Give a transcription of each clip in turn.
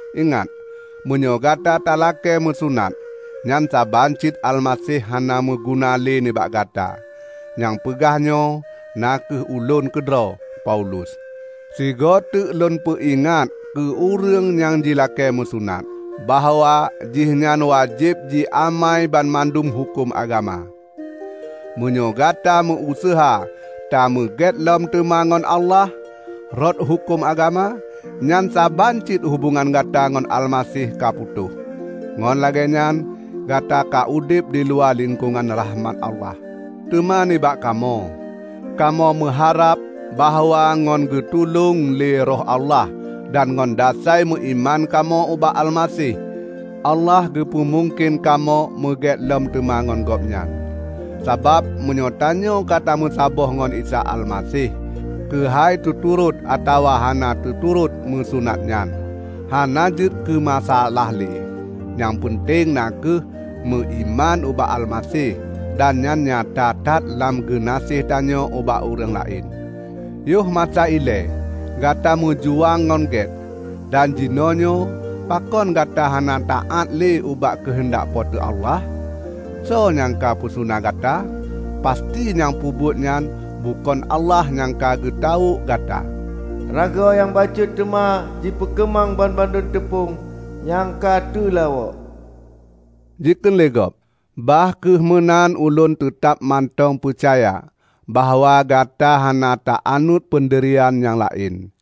Ingat, meunyoe gata talakée meusunat, nyan saban cit Almaseh hana meuguna lé nibak gata. Nyang peugah nyoe na kheueh ulôn keudroe, Paulus. Sigoeteuk lôn peuingat keu ureuëng nyang jilakée meusunat, bahwa jihnyan wajéb jiamai banmandum huköm agama! Meunyoe gata meu-useuha tameugét lom teuma ngon Allah rot huköm agama, nyan saban cit hubongan gata ngon Almaseh ka putôh. Ngon lagée nyan gata ka udeb diluwa lingkongan rahmat Allah. Teuma nibak kamoe, kamoe meuharab bahwa ngon geutulông lé Roh Allah dan ngon dasai meuiman kamoe ubak Almaseh, Allah geupeumungken kamoe meugét lom teuma ngon Gobnyan. Sabab meunyoe tanyoe ka meusaboh ngon Isa Almaseh, keuhai teuturot atawa hana teuturot meusunat nyan, hana jeuet keumasaalah lé. Nyang peunteng na kheueh meuiman ubak Almaseh, dan nyan nyata that lam geunaséh tanyoe ubak ureuëng laén. Yohmasa ilée gata meujuang ngon gét! Dan jinoenyoe pakon gata hana taát lé ubak keuheundak Po teu Allah? Soe nyang ka peusuna gata? Pasti nyang peubuet nyan bukon Allah nyang ka geutawök gata! "Rago nyang bacut teuma jipeukeumang banmandum teupông nyang ka teulawok," jikheun lé gob. Bah kheueh meunan ulôn teutab mantong peucaya bahwa gata hana ta anut peundirian nyang laén,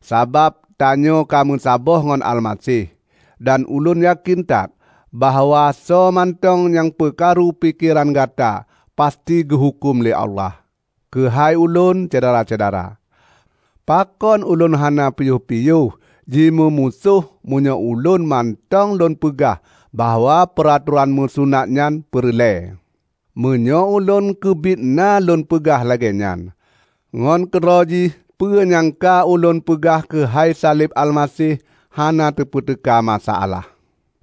sabab tanyoe ka meusaboh ngon Almaseh. Dan ulôn yakén that bahwa soe mantong nyang peukaru pikeran gata pasti geuhuköm lé Allah. Keuhai ulôn, syedara-syedara, pakon ulôn hana piôh-piôh jimeumusoh meunyoe ulôn mantong lôn peugah bahwa peuratoran meusunat nyan peureulée? Meunyoe ulôn keubiet na lôn peugah lagée nyan, ngon keudroe jih peue nyang ka ulôn peugah keuhai saleb Almaseh hana tepeuteuka masa alah.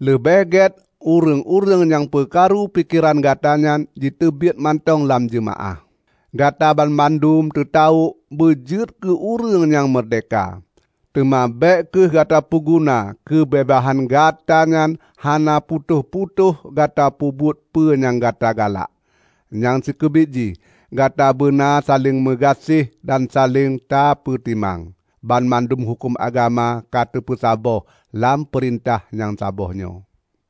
Leubeh gét ureuëng-ureuëng nyang peukaru pikeran gata nyan jiteubiet mantong lam jeumaáh! Gata banmandum teutawök beujeuet keu ureuëng nyang meurdehka. Teuma bék kheueh gata peuguna keubeubaihan gata nyan hana putôh-putôh gata peubuet peue nyang gata galak. Nyang sikeubiet jih, gata beuna saléng meugaséh dan saléng tapeutimang. Banmandum huköm agama ka teupeusaboh lam peurintah nyang saboh nyoe,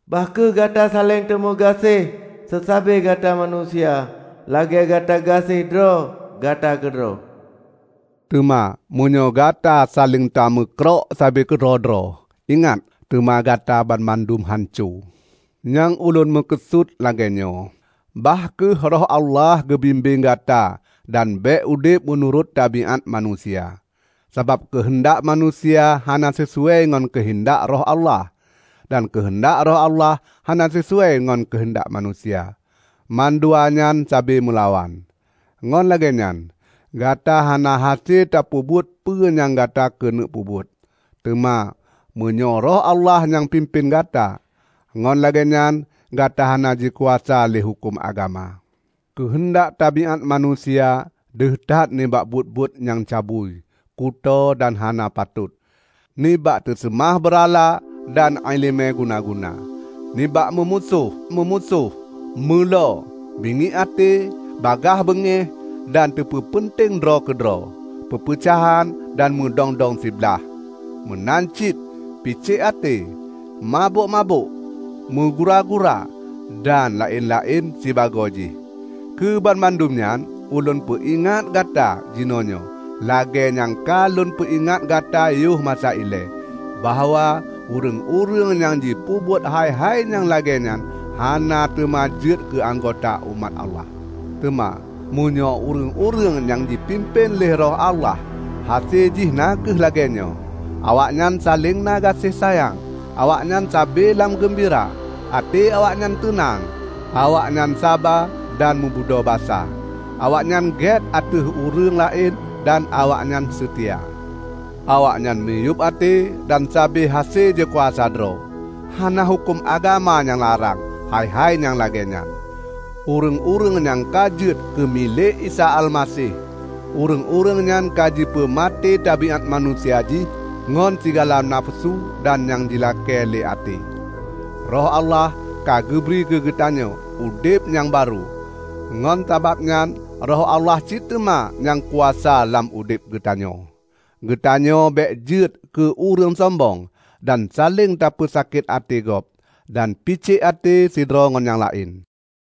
"Bah kheueh gata saléng tameugaséh seusabe gata manusia lagée gata gaséh droe gata keudroe." Teuma meunyoe gata saléng tameukrok sabe keudroe-droe, ingat, teuma gata banmandum hanco. Nyang ulôn meukeusut lagée nyoe: Bah kheueh Roh Allah geubimbéng gata dan bék udeb meunurot tabiát manusia. Sabab keuheundak manusia hana sisuai ngon keuheundak Roh Allah, dan keuheundak Roh Allah hana sisuai ngon keuheundak manusia. Mandua nyan sabe meulawan, ngon lagée nyan gata hana hase tapeubuet peue nyang gata keuneuk peubuet. Teuma meunyoe Roh Allah nyang pimpén gata, ngon lagée nyan gata hana jikuasa lé huköm agama. Keuheundak tabiát manusia deuh that nibak buet-buet nyang cabui, kutoe dan hana patot; nibak teuseumah beurala dan iéleumé guna-guna; nibak meumusoh-musoh, meulo, bingiek até, bagaih beungéh, dan teupeupeunteng droe keudroe; peupeucahan dan meudong-dong siblaih, meunan cit picék até, mabök-mabök, meugura-gura dan laén-laén sibagoe jih. Keu banmandum nyan ulôn peuingat gata jinoenyoe lagée nyang ka lôn peuingat gata yoh masa ilée, bahwa ureuëng-ureuëng nyang jipeubuet hai-hai nyang lagée nyan hana teuma jeuet keuanggota umat Allah. Teuma, meunyoe ureuëng-ureuëng nyang jipimpén lé Roh Allah, hase jih na kheueh lagée nyoe: Awaknyan saléng na gaséh sayang, awaknyan sabe lam geumbira, até awaknyan teunang, awaknyan saba dan meubudho basa, awaknyan gét ateueh ureuëng laén dan awaknyan seutia, awaknyan miyueb até, dan sabe hase jikuasa droe. Hana huköm agama nyang larang hai-hai nyang lagée nyan. Ureuëng-ureuëng nyang ka jeuet keu milék Isa Almaseh, ureuëng-ureuëng nyan ka jipeumaté tabiát manusia jih ngon sigala nafeusu dan nyang jilakée lé até. Roh Allah ka geubri keugeutanyoe udeb nyang barô; ngon sabab nyan Roh Allah cit teuma nyang kuasa lam udeb geutanyoe. Geutanyoe bék jeuet keu ureuëng sombong, dan saléng tapeusakét até gob, dan picék até sidroe ngon nyang laén.